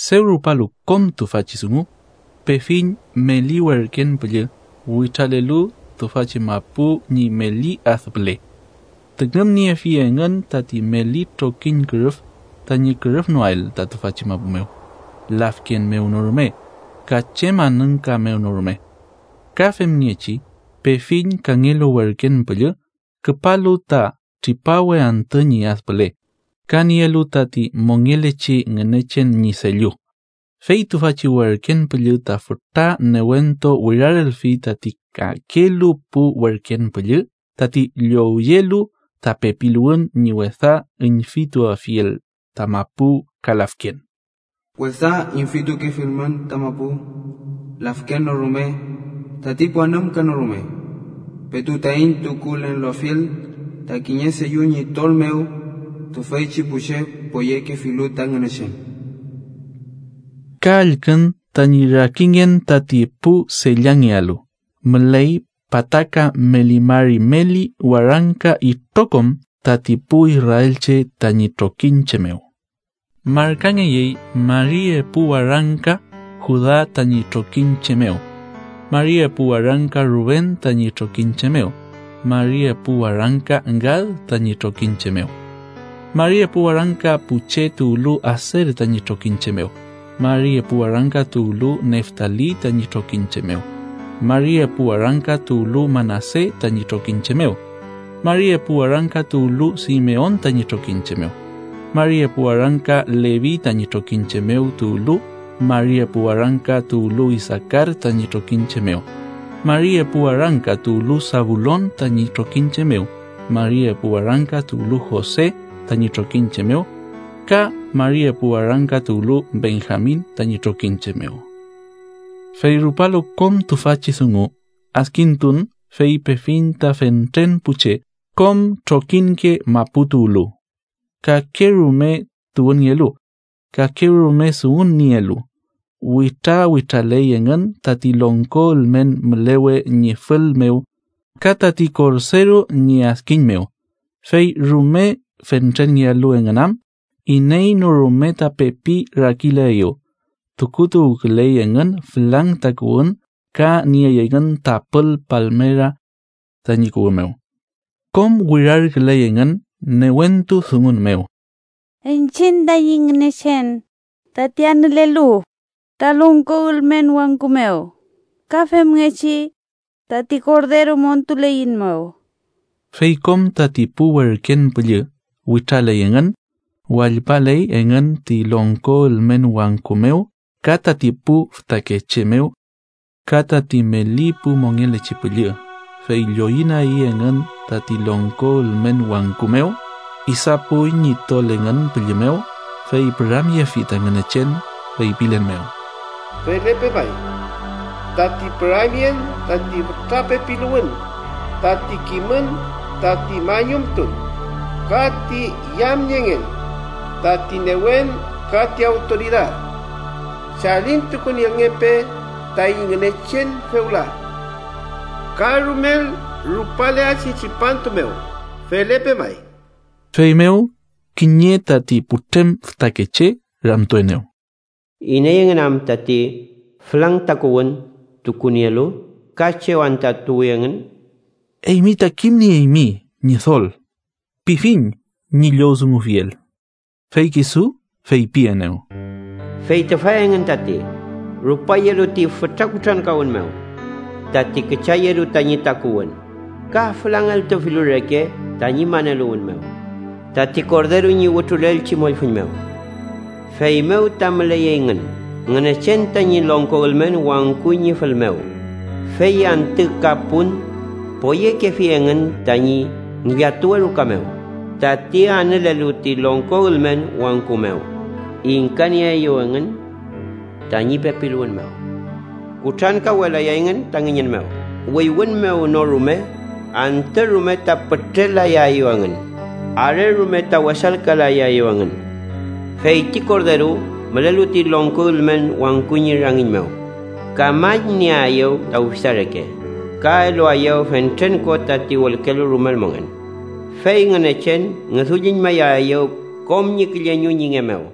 Dew rupalu kom tüfachi dungu, pefiñ meli werken püllü witralelu tüfachi mapu ñi meli ad püle, tüngümniefi engün tati meli trokiñ kürüf tañi kürüfnoael ta tüfachi mapu mew, lafken mew no rume ka chem anümka mew no rume. Ka femngechi pefiñ kangelu werken püllü küpalu ta tripawe antü ñi ad püle, ka nielu tati mongelechi Ngünechen ñi sellu. Fey tüfachi werken püllü ta fütra newentu wirarelfi tati kakelu pu werken püllü tati llowyelu ta pepiluwün ñi wesa üñfituafiel ta mapu ka lafken: “¡Wesa üñfitukefilmün ta mapu lafken no rume tati pu anümka no rume, petu taiñ tukulelnofiel ta kiñe sellu ñi tol mew tüfeychi pu che poyekefilu ta Ngünechen!” Ka allkün tañi rakingen tati pu sellangelu: müley pataka meli mari meli warangka itrokom tati pu israelche tañi trokiñche mew. Markangeyey mari epu warangka Juda tañi trokiñche mew, mari epu warangka Ruben tañi trokiñche mew, mari epu warangka Gad tañi trokiñche mew, mari epu warangka pu che tuwlu Aser tañi trokiñche mew, mari epu warangka tuwlu Neftali tañi trokiñche mew, mari epu warangka tuwlu Manase tañi trokiñche mew, mari epu warangka tuwlu Simeon tañi trokiñche mew, mari epu warangka Levi tañi trokiñche mew tuwlu, mari epu warangka tuwlu Isaakar tañi trokiñche mew, mari epu warangka tuwlu Sabulon tañi trokiñche mew, mari epu warangka tuwlu Jose tañi trokiñche mew ka mari epu warangka tuwlu Benjamin tañi trokiñche mew. Fey rupalu kom tüfachi dungu, adkintun, fey pefiñ ta fentren pu che kom trokiñke mapu tuwlu, kakerume tuwünngelu, kakerume dungun nielu. Witrawitraley engün tati longko ülmen mülewe ñi fül mew ka tati Korderu ñi adkiñ mew, fey rume fentrenngelu engün am, iney no rume ta pepi rakilaeyew. Tukutuwküley engün fülang takuwün ka nieyey engün tapül palmera tañi kuwü mew. Kom wirarküley engün newentu dungun mew: “¡Iñchiñ taiñ Ngünechen, tati anülelu ta longko ülmen wangku mew, ka femngechi tati Korderu montuleiñmew!” Fey kom tati pu werken püllü witraley engün, wallpaley engün ti longko ülmen wangku mew ka tati pu fütakeche mew ka tati meli pu mongelechi püllü. Fey lloyünagi engün tati longko ülmen wangku mew, idapuy ñi tol engün pülli mew, fey püramyefi ta Ngünechen, feypilen mew: “¡Felepe may! Tati püramyen, tati fütra pepiluwün, tati kimün, tati mañumtun, ka ti yamniengen, tati newen ka ti awtoridad chalintukunielngepe taiñ Ngünechen fewla ka rumel rupaleachi tripantu mew. ¡Felepe May!” Feymew kiñe tati putrem fütakeche ramtuenew: “¿Iney engün am tati fülang takuwün tukunielu, ka chew anta tuwi engün?” “Eymi ta kimnieymi, ñidol”, pifiñ ñi llowdungufiel. Fey kisu feypienew: “Fey tüfa engün tati rupayelu ti fütra kutrankawün mew, tati küchayelu tañi takuwün ka fülangeltufilu reke tañi maneluwün mew tati Korderu ñi wütrulelchi mollfüñ mew. “Feymew ta müley engün Ngünechen tañi longko ülmen wangku ñi fül mew, fey antü ka pun poyekefi engün tañi ngillatuwe ruka mew. Tati anülelu ti longko ülmen wangku mew ingkanieaeyew engün tañi pepiluwün mew. Kutrankawwelayay engün ta ngüñün mew, wüywün mew no rume, antü rume ta pütrelayaeyew engün, are rume ta wesalkalayaeyew engün. Fey ti Korderu, mülelu ti longko ülmen wangku ñi rangiñ mew, kamañnieaeyew ta ufisa reke, ka eluaeyew fentren ko tati wülkelu rumel mongen, fey Ngünechen ngüdulluñmayaeyew kom ñi külleñu ñi nge mew.”